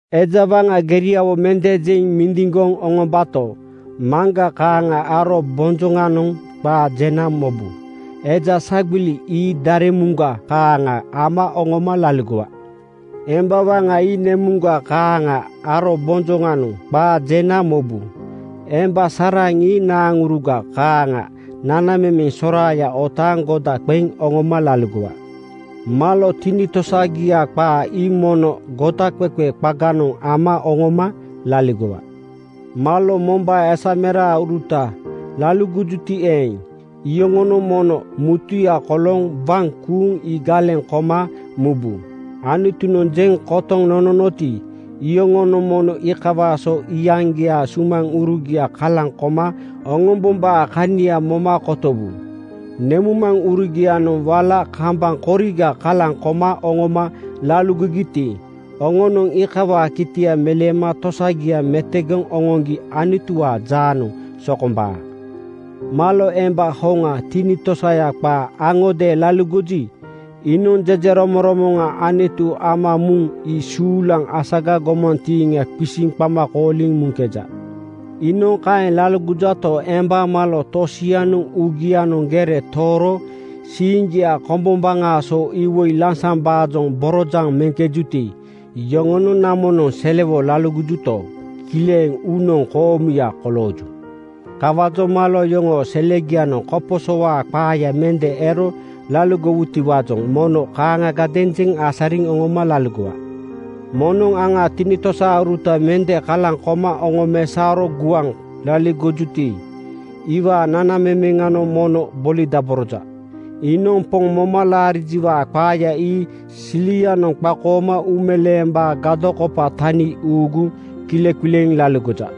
Eja waŋa ii geriawo mende jeŋ mindiŋgoŋ oŋombato, maŋga kaaŋa arobonjoŋanoŋ qaa jena mobu. Eja sagbili ii daremuŋuruga kaaŋa ama oŋoma laligowa. Emba waŋa ii nemuŋga kaaŋa arobonjoŋanoŋ qaa jena mobu. Emba saraŋ ii naaŋuruga kaaŋa nanamemeŋ soraaya otaaŋ goda qeŋ oŋoma laligowa. Malo tinitosagia qaa ii mono godaqeqe qaganoŋ ama oŋoma laligowa. Malo mombaa esamerauruta laligojuti eeŋ, iyoŋonoŋ mono mutuya kolooŋ waŋ kuuŋ ii galeŋ koma mubu. Anutunoŋ jeŋ kotoŋ nononoti, iyoŋonoŋ mono iikawaa so iyaŋgiaa sumaŋurugia kalaŋ koma oŋombombaa kania moma kotowu. Nemuŋmaŋurugia-noŋ wala kambaŋ koriga kalaŋ koma oŋoma laligogiti, oŋonoŋ iikawaa kitia meleema tosagia metogoŋ oŋoŋgi Anutuwaa jaanoŋ sokombaa. Malo emba hoŋa, tinitosaya qaa aŋodeeŋ laligoji, iinoŋ jejeromoŋromoŋa Anutu ama muŋ ii suulaŋ asaga gomantiiŋa qisiŋ qama kooliŋ muŋkeja. Iinoŋ kaeŋ laligojato, emba malo tosianoŋ uugianoŋ gere tooro siiŋgia kombombaŋaa so iwoi lansambaajoŋ borojaŋ meŋkejuti, iyoŋonoŋ namonoŋ selewo laligojuto, kileŋ uunoŋ koomuya kolooju. Kawaajoŋ malo yoŋoo selegianoŋ koposowaa qaaya mende ero laligowutiwaajoŋ mono kaaŋagadeeŋ jeŋ asariŋ oŋoma laligowa. Moŋnoŋ aŋaa tinitosauruta mende kalaŋ koma oŋomesaoro guaŋ laligojuti, iwaa nanamemeŋanoŋ mono bolidaboroja. Iinoŋ Poŋ moma laarijiwaa qaaya ii silianoŋ qakooma uumeleembaa gadokopa tani uuguŋ kileqileeŋ laligoja.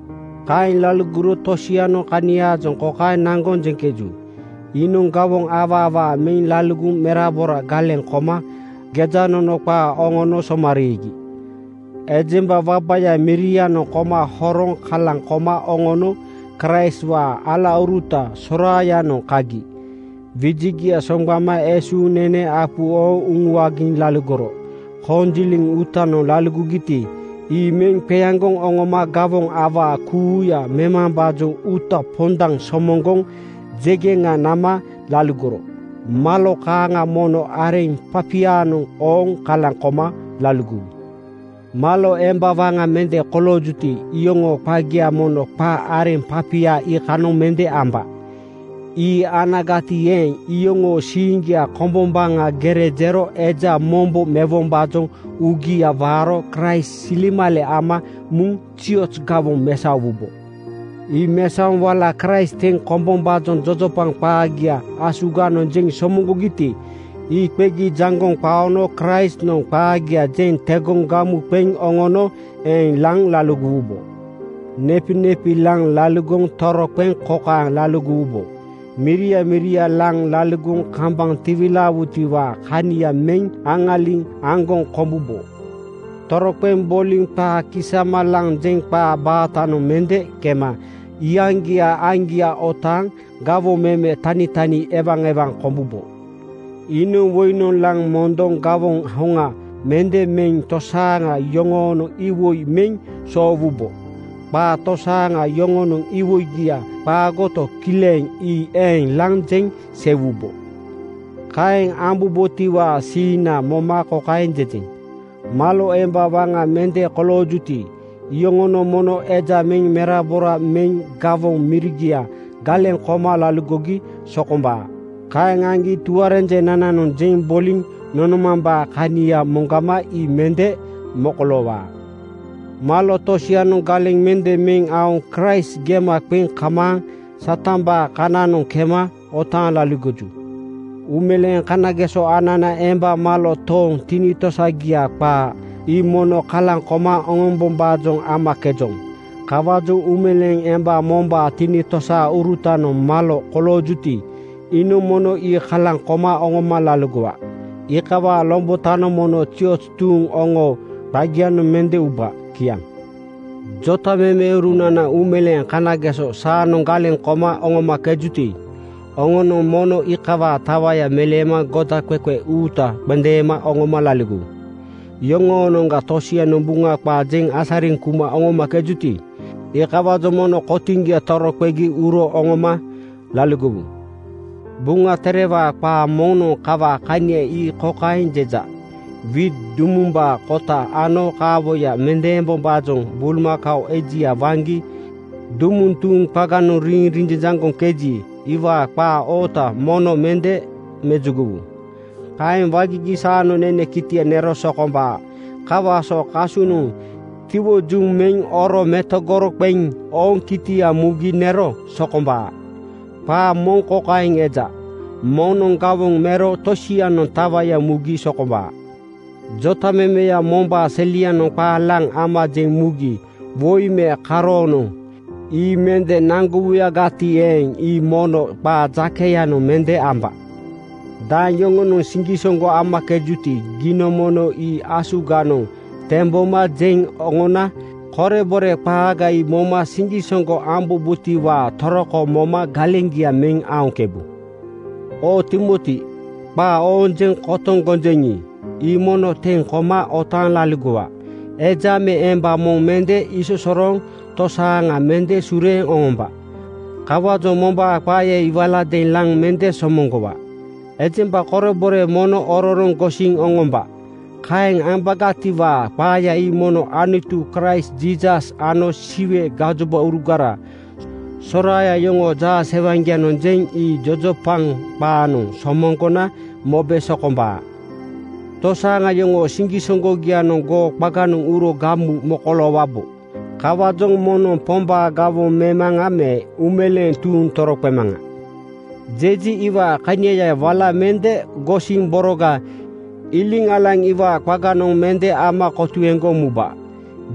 Kaeŋ laligoro tosianoŋ kaniaajoŋ kokaeŋ naŋgoŋ jeŋkeju: Iinoŋ gawoŋ awaa awaa meŋ laligoŋ merabora galeŋ koma gejanono qaa oŋono somariigi. Ejemba wabaya mirianoŋ koma horoŋ kalaŋ koma oŋono Kraistwaa alauruta soraayanoŋ kagi wijigia soŋgbama esuuŋ nene apu ooŋ uŋuagiŋ laligoro. Konjiliŋ uutanoŋ laligogiti, ii meŋ qeaŋgoŋ oŋoma gawoŋ awaa kuuya memambaajoŋ uuta pondaŋ somoŋgoŋ jegeŋa nama laligoro. Malo kaaŋa mono areŋ papianoŋ ooŋ kalaŋ koma laligowu. Malo emba waŋa mende koloojuti, iyoŋoo qagia mono qa areŋ papia iikanoŋ mende amba. Ii anagati eeŋ, iyoŋoo siiŋgia kombombaŋanoŋ gere jero eja mombo mewombaajoŋ uugia waaro Kraist silemale ama muŋ zioz gawoŋ mesaowubo. Ii mesaoŋ wala Kraist teŋ kombombaajoŋ jojopaŋ qaagia asuganoŋ jeŋ somoŋgogiti, ii qegi jaŋgoŋ qaono Kraistnoŋ qaagia jeŋ tegoŋ gamu qeŋ oŋono eeŋ laŋ laligowubo. Nepinepi laŋ laligoŋ toroqeŋ kokaeŋ boliwubo: Miria miria laŋ liligoŋ kambaŋ tiwilaawutiwaa kania meŋ aŋaliŋ aŋgoŋ kombubo. Toroqeŋ boliŋ qaa kisama laŋ jeŋ qaa baatanoŋ mende kema iyaŋgiaa aiŋgia otaaŋ gawoŋ meme tanitani ewaewaŋ kombubo. Iinoŋ woinoŋ laŋ mondoŋ gawoŋ hoŋa mende meŋ tosaaŋa yoŋoonoŋ iwoi meŋ soowubo. Qaa tosia yoŋoonoŋ iwoiga qaagoto, kileŋ ii eeŋ laŋ jeŋ seiwubo. Kaeŋ ambubotiwaa siiŋna moma kokaeŋ jejeŋ: Malo emba waŋa mende koloojuti, iyoŋonoŋ mono eja meŋ merabora meŋ gawoŋ mirigia galeŋ koma laligogi sokombaa. Kaeŋ aŋgi tuarenjenananoŋ jeŋ boliŋ nonomambaa kania moŋgama ii mende mokoloowaa. Malo tosianoŋ galeŋ mende meŋ aoŋ Kraist gema qeŋ kamaaŋ Satambaa kananoŋ kemeŋ otaaŋ laligoju. Uumeleeŋ kanageso anana emba malo tooŋ, tinitosagia qaa laligojuti, ii mono kalaŋ koma oŋombombaajoŋ amakejoŋ. Kawaajoŋ uumeleeŋ emba mombaa tinitosaurutanoŋ malo koloojuti, iinoŋ mono ii kalaŋ koma oŋoma laligowa. Iikawaa lombotanoŋ mono zioz tuuŋ oŋoo qagianoŋ mende uba. Kiaŋ. Jotamemeurunana uumeleeŋ kanageso saanoŋ galeŋ koma oŋomakejuti, oŋonoŋ mono iikawaa tawaya meleema godaqeqe uuta qendeema oŋoma laligowu. Yoŋoonoŋga tosianoŋ Buŋa qaa jeŋ asariŋ kuma oŋomakejuti, iikawaajoŋ mono kotiŋgia toroqegi uro oŋoma laligowu. Buŋa Terewaa qaa moŋnoŋ kawaa kania ii kokaeŋ jeja, “Wiit dumumbaa kota ano kaawoya mendeembombaajoŋ bulmakao ejia waŋgi dumuŋ tuuŋ qaganoŋ riiŋ rinjanjaŋgoŋkeji, iwaa qaa oota mono mende mejugowu. Kaeŋ wagigi saanoŋ nene kitia nero sokombaa.” (Kawaa so kasunoŋ tiwojuŋ meŋ oro metogoro qeŋ ooŋ kitia mugi nero sokombaa.) Qaa moŋ kokaeŋ eja, “Moŋnoŋ gawoŋ mero tosianoŋ tawaya mugi sokombaa.” Jotamemeya mombaa selianoŋ qaa laŋ ama jeŋ mugi woi me karoonoŋ ii mende naŋgowuyagati eeŋ, ii mono qaa jakeyanoŋ mende amba. Daeŋ yoŋonoŋ siŋgisoŋgo amakejuti, giinoŋ mono ii asuganoŋ temboma jeŋ oŋona korebore qaaga ii moma siŋgisoŋgo ambombotiwaa toroko moma galeŋgia meŋ aoŋkebu. Oo Timoti, qaa ooŋ jeŋ kotoŋ gonjeŋi, ii mono teŋ koma otaaŋ laligowa. Eja me emba moŋ mende isosorooŋ tosaaŋa mende sureeŋ oŋomba. Kawaajoŋ mombaa qaaya ii waladeeŋ laŋ mende somoŋgowa. Ejemba korebore mono ororoŋ gosiŋ oŋomba. Kaeŋ ambagatiwaa qaaya ii mono Anutu, Kraist Jiisas ano Siwe gajobaurugara soraaya yoŋoo jaasewaŋgianoŋ jeŋ ii jojopaŋ qaanoŋ somoŋgona mobe sokombaa. Tosaaŋa yoŋoo siŋgisoŋgogianoŋ goo qaganoŋ uro gamu mokoloowabo. Kawaajoŋ moŋnoŋ “Pombaa gawoŋ memaŋa,” me “Uumeleeŋ tuuŋ toroqemaŋa,” jeji, iwaa kaniaya wala mende gosiŋ boroga iliŋ alaŋ iwaa qaganoŋ mende ama kotuegoŋ muba.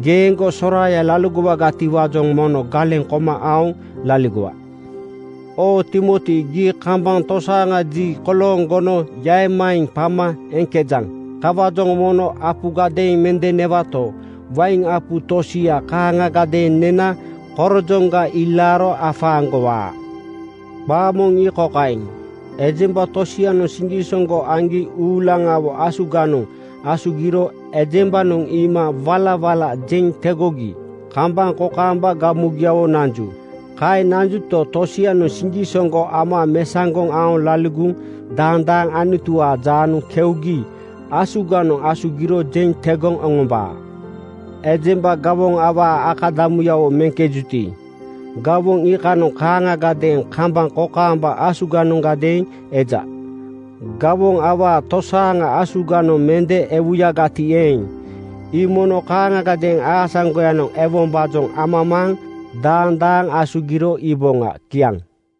Geeŋgo soraaya laligowagatiwaajoŋ mono galeŋ koma aoŋ laligowa. Oo Timoti, gii kambaŋ tosaaŋa ji kolooŋ gono “Yaeŋmaeŋ!” qama eŋkejaŋ. Kawaajoŋ mono apugadeeŋ mende newato, wain apu tosia kaaŋagadeeŋ nena korojoŋga ilaaro afaaŋgowaa. Qaa moŋ ii kokaeŋ: Ejemba tosianoŋ siŋgisoŋgo aŋgi uulaŋawo asuganoŋ asugiro ejembanoŋ iima walawala jeŋ tegogi kambaŋ kokaamba gamugiawo nanju. Kaeŋ nanjuto, tosianoŋ siŋgisoŋgo ama mesaŋgoŋ aoŋ laligoŋ daandaaŋ Anutuwaa jaanoŋ keugi asuganoŋ asugiro jeŋ tegoŋ oŋombaa. Ejemba gawoŋ awaa akadamuyawo meŋkejuti, gawoŋ iikanoŋ kaaŋagadeeŋ kambaŋ kokaamba asuganondeeŋ eja. Gawoŋ awaa tosaaŋa asuganoŋ mende ewuyagati eeŋ, ii mono kaaŋagadeeŋ aasaŋgoyanoŋ ewombaajoŋ amamaaŋ daandaaŋ asugiro iiboŋa. Kiaŋ.